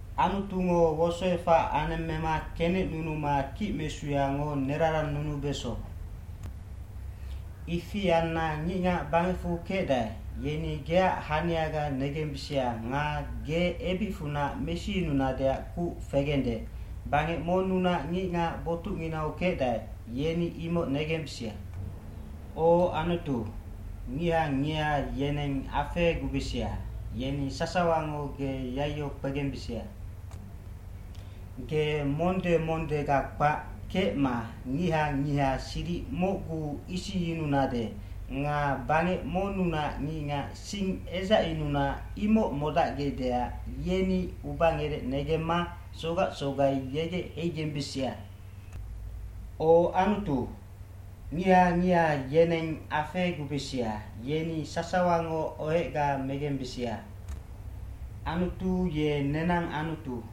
Anutungo wosoefac anemmema kenecnunuma kicmesuyango nerarannunubeso. Ifi anna ngicngac bangecfu kecdae, yeni geac haniaga negembisia nga ge ebicfunac mesiyununadeac kuc fegende, bangec monnunac ngicngac botucnginau kecdae, yeni imoc negembisia. O Anutu, ngiha ngiha yeneng afegubisia, yeni sasawango ge yaiyo kpegembisia. Ge monde mondega kpac kecma ngiha ngiha siric mocguu isingyununade nga bangec monnunac ngicngac sing edzacyununa imoc modacgecdeac yeni ubangerec negemma sogac sogai yegec heigembisia. O Anutu, ngiha ngiha yeneng afegubisia, yeni sasawango ohecga megembisia. Anutu ye nenang Anutu.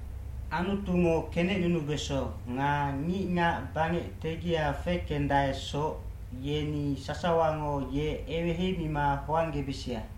Anutungo kenecnunubeso nga ngicngac bangec tegia fekendaesoc, yeni sasawango ye eweheimima hoanggebisia.